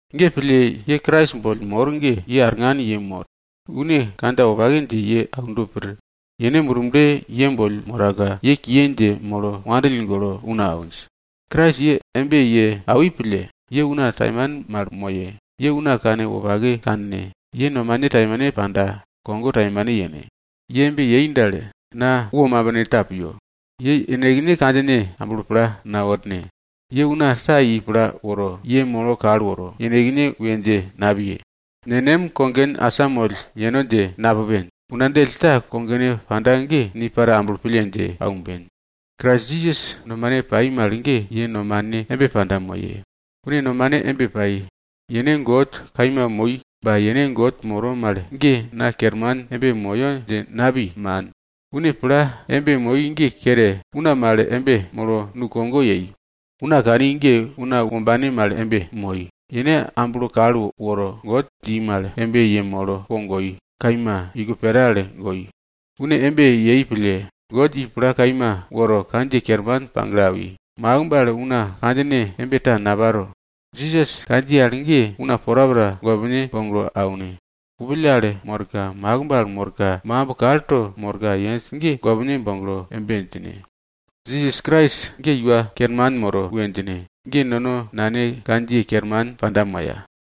Ge pille ye Krais boll mor ge ye arngan yemor. Une kandja wopake dje ye aundo pir. Yene Murble ye boll moraka ye kiye dje molo wandill golo una awinj. Krais ye embe ye awi pille, ye una taimane mal moye, ye una kanwopake kanne, ye nomane taimane panda kogo taimane yene. Ye embe yei dal, na wo mabinta mal piyo. Ye yenekne kandjine amblo pla naworne. Ye una ta i pla woro, ye molo kal woro, yenekne we dje napiye. Nenem kogen asamoll yeno dje napupen. Una djell ta kogone panda ge, ni para amblo pille dje aumben. Krais Jisas nomane pai mal ge ye nomane embe panda moye. Une nomane embe pai. Yene God kaima moi, ba yene God moro mal ge na kerman embe moyo dje napi, man. Une pla embe moi ge kere, una mal embe molo nukogo yei. Una kani ge una wombane mal embe moi, yene amblo kal woro, God dji mal embe yemolo po goi, kaima, iko pera al goi. Une embe yei pille, God i pla kaima woro kandjiye kerman pagle awi, makimb al una kandjine embe ta naparo. Jisas kandjiye al ge una porapora gopne boglo aune. Kupill al morka, makimb al morka, makimb kalto morka yenj ge gopne boglo embe djine, Jisas Krais ge Iwa Kerman moro we djine. Ge nono Nane God kandjiye kerman panda moya.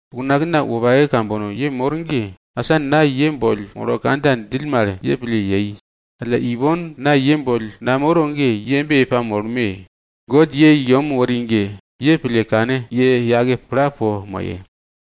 Unakna wopake kambono ye mor ge, asa na ye boll molo kandja djill mal ye pille yei. Alla ipon na ye boll namoro ge ye embe ye pamolme! God ye i yem wori ge, ye pille kane ye yake pla po moye.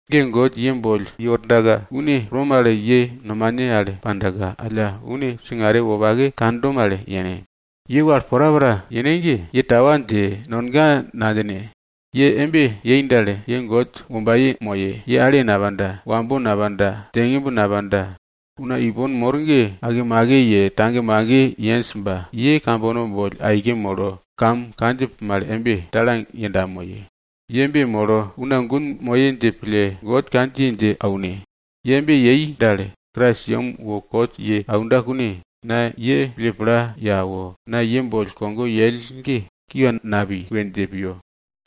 Ge God ye boll yewordaka, une pro mal ye nomane al pandaka, alla une singare wopake kando mal yene. Ye wal porapora yene ge, ye tawa dje, nonga nadjine. Ye embe yei dal, ye God wombaye moye, ye ale napanda, wambo napanda, djengimb napanda. Una ipon mor ge akemake ye, tagemage yenj ba ye kambono boll aike molo kam kandjip mal embe talang yenda moye. Ye embe molo una gun moye dje pille God kandjiye dje aune. Ye embe yei dal, Krais yem wo kot ye aunda kune, na ye pille pla ye awo, na ye boll kogo yell ge kiwa napi we dje piyo.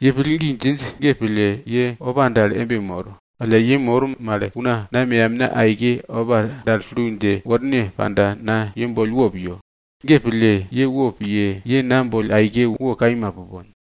Ye pillgi djinj ge pille, ye opa dal embe mor, alla ye mor mal una na meyamna aike opa dal tulu dje worne panda, na ye boll wo piyo. Ge pille, ye wopiye, ye na boll aike wo kaima pupon.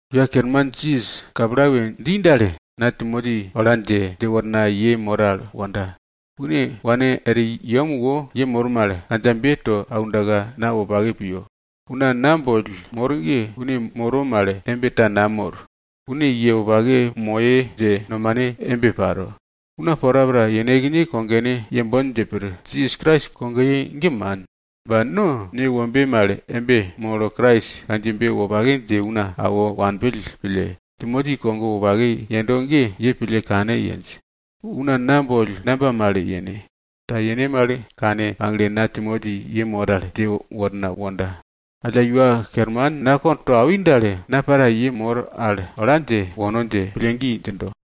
Iwa Kerman Jisas kapla we dji dal, na Timoti ola dje, dje wornaka ye mor al wonda. Une wane er yem wo ye mor mal kandjabe to aundaka na wopake piyo. Una na boll mor ge une moro mal embe ta namor. Une ye wopake moye dje nomane embe paro. Una porapora yenekne kogone yembon dje pir. Jisas Krais kogoye ge man. Ba no newombe mal embe molo Jisas kandjiyebe wopake dje una awo wanpill pille, Timoti kogo wopake yendo ge ye pille kane yenj. Una na boll namba mal yene? Ta yene mal kane pagle na Timoti ye mor al dje worna wonda. Alla Iwa Kerman na kondwe ta to awi dal, na para ye mor al ola dje wono dje pillgi djindo.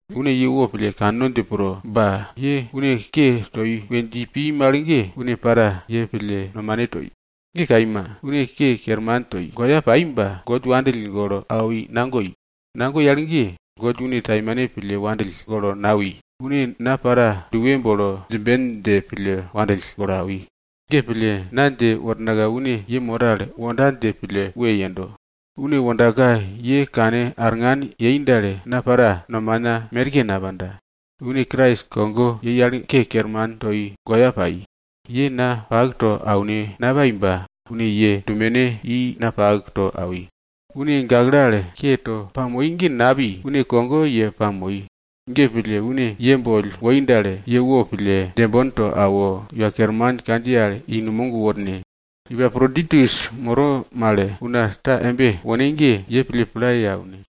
Une ye wopille kanno dje pro, ba ye une ke toi we dji pi mal ge, une para ye pille nomane toi. Ge kaima, une ke kerman toi, goya pai ba God wandill golo awi nagoi. Nagoi al ge, God une taimane pille wandill golo nawi, une na para duwe bolo djimben dje pille wandill golo awi. Ge pille, na dje wornaka une ye mor al wonda dje pille we yendo. Une wondaka ye kane arngan yei dal, na para nomana merke napanda. Une Krais kogo yei al ke kerman toi, goya pai. Ye na pak to aune napai ba une ye dumene i na pak to awi. Yene gakle al ke to pamoi ge napi, une kogo ye pamoi. Ge pille, une ye boll woi dal, ye wopille djembon to awo, Iwa Kerman kandjiye al i numog worne. Epaproditus moro mal, una ta embe wone ge, ye pille pla ye aune.